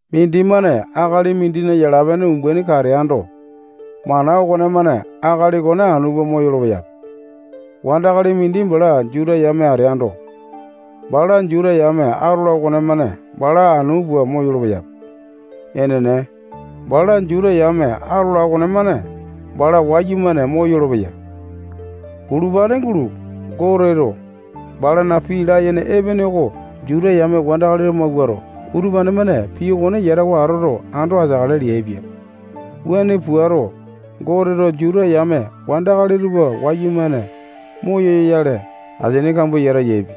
Mindimane akali mindina yala-pene umbaini kateaindo, mana okonemane akali okone anu pua moyolo-peyape. Wandakali mindi bala Juta yame ateando, bala Juta yame atola okonemane bala anu puato moyolo-peyape. Enene, bala Juta yame atola okonemane bala wayumane moyolo-peya. Bulupane gulo, Goteto balana pii layene epene oko Juta yame wandakali tupa mawuato, utupane-mane pii okone yatawa atoto, ando ateakale leaipia. Wuane puato, Goteto Juta yame wandakali tupa wayumane moyoyale, asini kambua yata yaepia.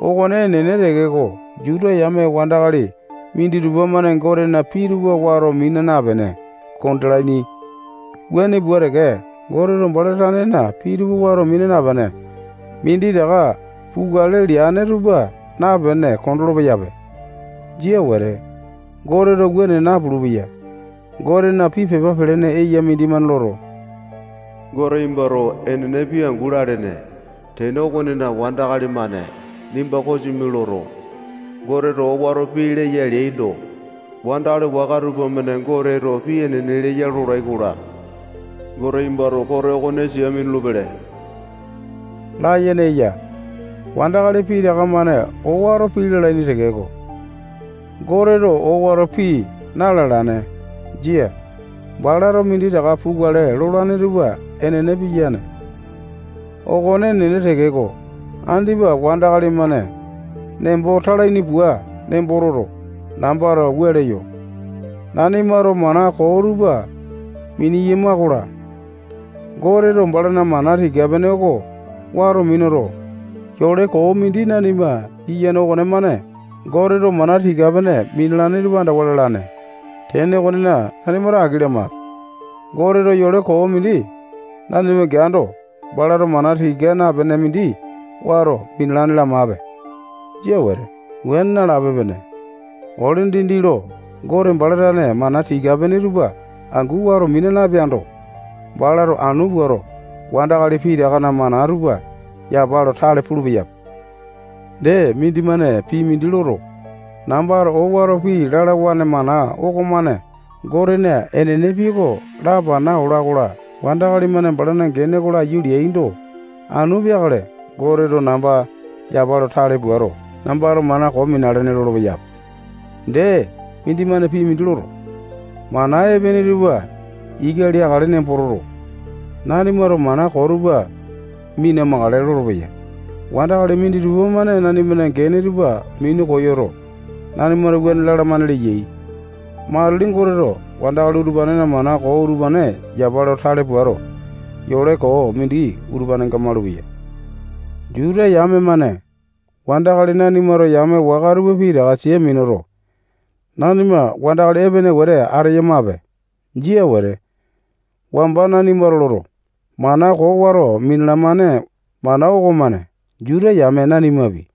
Okone enene tekeko, Juta yame wandakali minditupa-mane Gotena pii tupa wato mina napene kondalaini. Wuane pua teke, Goteto bala tanena pii tupa wato mina napene, minditaka pukale leane tupa napene, kondolo-peyape. Jia wete. Goteto wuane napulu-peya. Gotena pii pepa pelene eya mindimane loto, Gote nimbato enene pii angu lalene. Tene okonena, wandakali-mane nimba kosimi loto, Goteto owato pii leya leaindo, wandakali waka tupamane Goteto pii enene leya lolai-kola, nimbato kote okone sia minulu-pele layene eya. Wandakali pitaka-mane owato pii lalaini tekeko, Goteto owato pii na-alane. Jia. Balato minditaka pukale lolane tupa enene piyane. Okone enene tekeko, andipa wandakali-mane nembo talaini pua nembo toto, nambato wua leyo: Nanimato mana koo tupa mineyama-kola, Goteto balana mana tika-pene oko wato minuto, yole koo mindi nanima giyane okonemane Goteto mana tika-pene minalane tupa andawa lalane. Tene okonena, nanimato aki lamape. Goteto yole koo mindi nanima geando, balato mana tika napene mindi wato minalane lamape. Jia wete. Wuane nalape-pene. Ole dindi lo Gote bala tane mana tika-pene tupa angu wato mina napeando, balato anu puato wandakali pitakana mana tupa yapa lo tale pulu-peyape. Dee, mindimane pii mindi loto, nambato owato pii lalawane mana okomane Gotena enene pii oko lapana ola-kola, wandakali-mane balana gene oko laiyu leaindo, anu peakale Goteto namba yapa lo tale puato, nambato mana koo minalene leyape lolopeya. Dee, mindimane pii mindi loto, mana epene tupa ika leakale nembo toto, nanimato mana koo tupa mina-makale lolopeya. Wandakali minditupa-mane nanimana gene tupa minu koyoto, nanimato wuane lalamane leyai. Matili Goteto wandakali utupanena mana koo utupane yapa lo tale puato, yole koo mindi utupanenga malupeya. Juta yame-mane wandakali nanimato yame waka tupa pitaka sia minuto, nanima wandakali epene wete ateyamape. Jia wete. Wamba nanimato loto, mana koo wato minalamane mana okomane Juta yame nanimapi,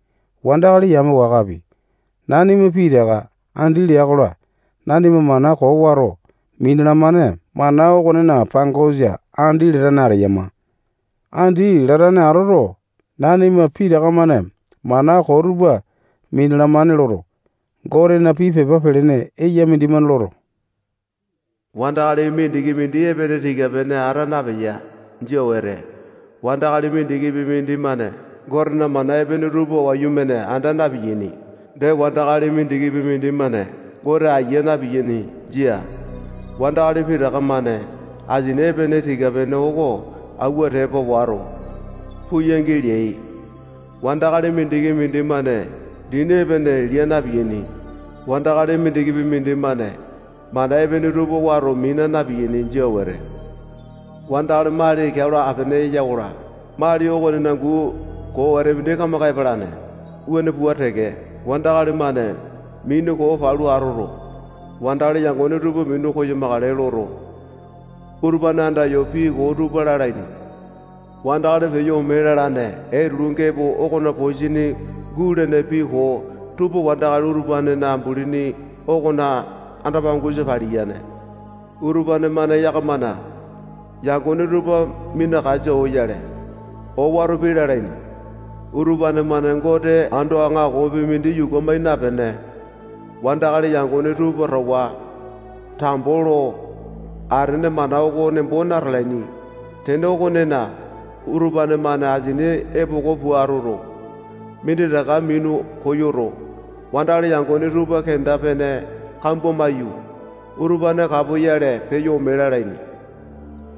wandakali yame wakapi, nanima pitaka andi lea-kola, nanima mana koo wato minalamane mana okonena pangosa andi latane ateyama. Andi latane atoto, nanima pitaka-mane mana koo tupa minalamane loto, Gotena pii pepa pelene eya mindimane loto, wandakali mindiki mindi epene tika-pene ata napeya. Jia wete. Wandakali mindikipi mindimane Gotena mana epene tupa wayumane anda na-piyaini. Dee, wandakali mindikipi mindimane Gote aiya na-piyaini. Jia. Wandakali pitaka-mane asini epene tika-pene oko auwa tepa wato, puu yangi leai. Wandakali mindiki mindimane dini epene lia na-piyaini. Wandakali mindikipi mindimane mana epene tupa wato mina na-piyaini. Jia wete. Wandakali mali keao lo apene eya-kola, mali okonena guu koo wete mindi kamaka epalane. Wuane pua teke, wandakali-mane mini koo palu atoto, wandakali yangone tupa minu koyamakale loto, utupane andayo pii koo tupa lalaini. Wandakali peyo ome lalane etulu gepo okona posini gulene pii koo tupa wandakali utupanena ambulini okona anda-pangosa paliyane. Utupane-mane yakamana yangone tupa minakasa oyale, owato pii lalaini. Utupane-mane Gote ando aŋakopi mindi yuku amai napene, wandakali yangone tupa towa tambo lo atene mana oko nembo natalaini. Tene okonena, utupane-mane asini epoko pua atoto, minditaka minu koyoto, wandakali yangone tupa kenda-pene kambua maiyu, utupane kapoyale peyo ome lalaini.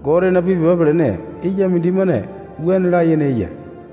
Gotena pii pepa pelene eya mindimane wuane layene eya.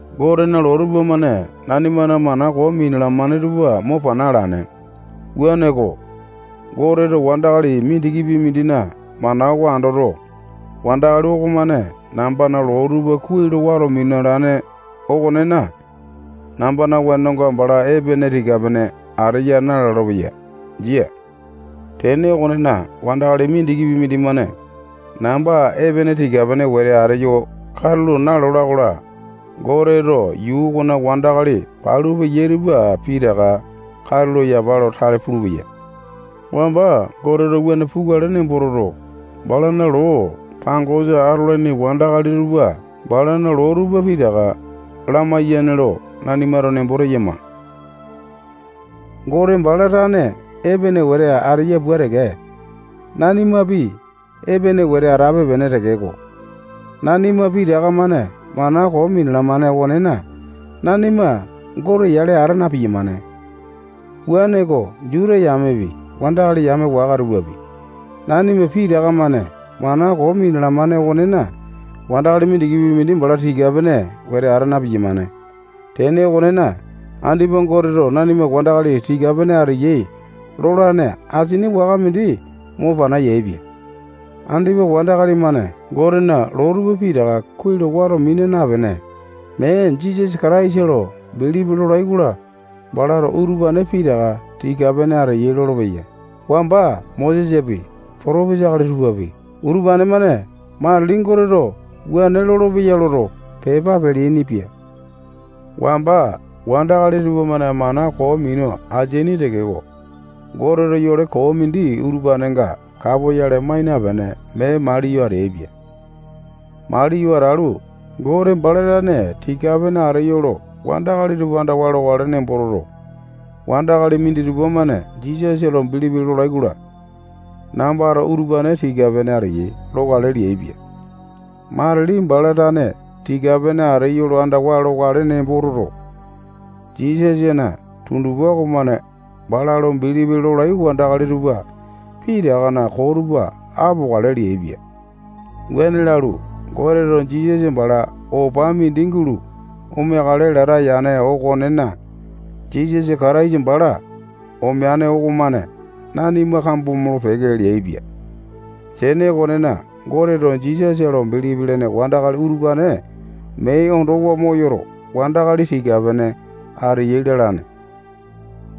Gotena loo tupamane nanimana mana koo minalamane tupa mo pana alane. Wuaneko, Goteto wandakali mindikipi mindina mana oko andoto, wandakali okomane nambana loo tupa kuai lo wato minalane okonena, nambana wenonga bala epene tika-pene ateya nalolo-peya. Jia. Tene okonena, wandakali mindikipi mindimane namba epene tika-pene wete ateyo katulo nalola-kola, Goteto yuu okona wandakali palu peya tupa pitaka katulo yapa lo tale pulupeya. Wamba Goteto wuane pukale nembo toto, balana loo pangosa atolaini wandakali tupa balana loo tupa pitaka lamaiyane lo nanimato nembo teyama. Gote bala tane epene wete ateya pua teke, nanimapi epene wete atape-pene tekeko, nanima pitaka-mane mana koo minalamane okonena, nanima Gote yale ata na-piyamane. Wuaneko, Juta yamepi, wandakali yame waka tupapi, nanima pitaka-mane mana koo minalamane okonena, wandakali mindikipi mindi bala tika-pene wete ata na-piyamane. Tene okonena, andipa Goteto nanima wandakali tika-pene ateyai lolane asini waka mindi mo pana yaepia. Andipa wandakali-mane Gotena loo tupa pitaka kuai lo wato mina napene, mee Jisasa Kataisa lo bilipi lolai-kola, balato utupane pitaka tika-pene ateyai lolopeya. Wamba Mosesapi, potopisa akali tupapi, utupane-mane matili Goteto wuane lolopeya loto, pepa peleaini-pia. Wamba wandakali tupamane mana koo minu ateaini tekeko, Goteto yole koo mindi utupanenga kapoyale mai napene, mee maliyo ateaipia. Maliyo atalu, Gote bala tane tika-pene ateyo lo wandakali tupa andawa lokale nembo toto, wandakali minditupa-mane Jisasa lo bilipi lolai-kola, nambato utupane tika-pene ateyai lokale leaipia. Matili bala tane tika-pene ateyo lo andawa lokale nembo toto, Jisasana tundupa okomane bala lo bilipi lolai wandakali tupa pitakana koo tupa apokale leaipia. Wuane lalu, Goteto Jisasa bala opa mindi gulo omeakale lata yane okonena, Jisasa Kataisa bala omeane okomane nanima kambo molo-peke leaipia. Tene okonena, Goteto Jisasa lo bilipi lene wandakali utupane mee ondowa moyoto, wandakali tika-pene ateyai lalane.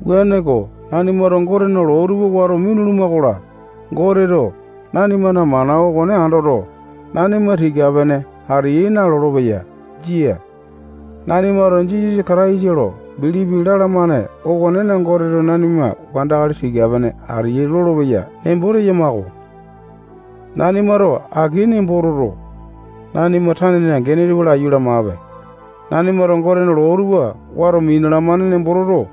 Wuaneko, nanimato Gotena loo tupa wato minuluma-kola, Goteto nanimana mana okone andoto, nanima tika-pene ateyai nalolo-peya. Jia. Nanimato Jisasa Kataisa lo bilipi lalamane okonena, Goteto nanima wandakali tika-pene ateyai lolopeya nembo teyama-ko. Nanimato aki nembo toto, nanima tanena gene tupa laiyu lamape. Nanimato Gotena loo tupa wato minalamane nembo toto,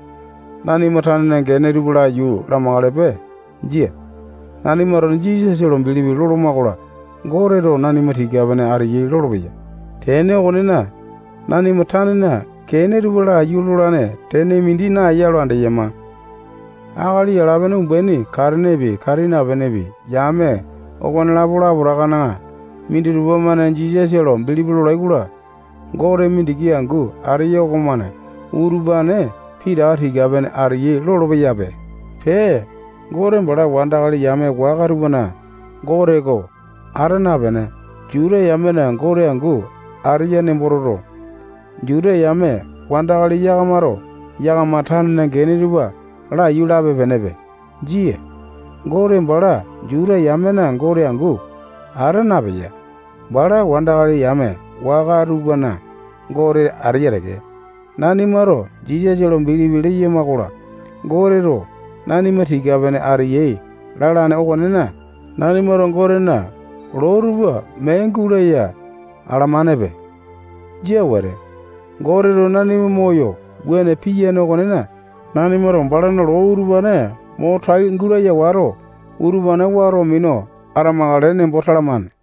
nanima tanena gene tupa laiyu lamakalepe. Jia. Nanimato Jisasa lo bilipi loloma-kola, Goteto nanima tika-pene ateyai lolopeya. Tene okonena, nanima tanena gene tupa laiyu lolane tene mindi naeya lo andeyama. Akali yala-pene umbaini katenepi, kati napenepi, yame okonelapo lapotakana minditupa-mane Jisasa lo bilipi lolai-kola, Gote mindiki angu ateya okomane utupane pitaka tika-pene ateyai lolopeya. Pee, Gote bala wandakali yame waka tupana Gote oko ata napene, Juta yamena Gote angu ateya nembo toto, Juta yame wandakali yakamato yakama tanena gene tupa laiyu lape-penepe. Jia. Gote bala Juta yamena Gote angu ata napeya. Bala wandakali yame waka tupana Gote ateya teke. Nanimato Jisasa lo bilipi leyama-kola, Goteto nanima tika-pene ateyai lalane okonena, nanimato Gotena loo tupa mee gulaya alamanepe. Jia wete. Goteto nanima moyo wuane piyane okonena, nanimato balana loo utupane mo tai gulaya wato, utupane wato minu atamakale nembo talamane.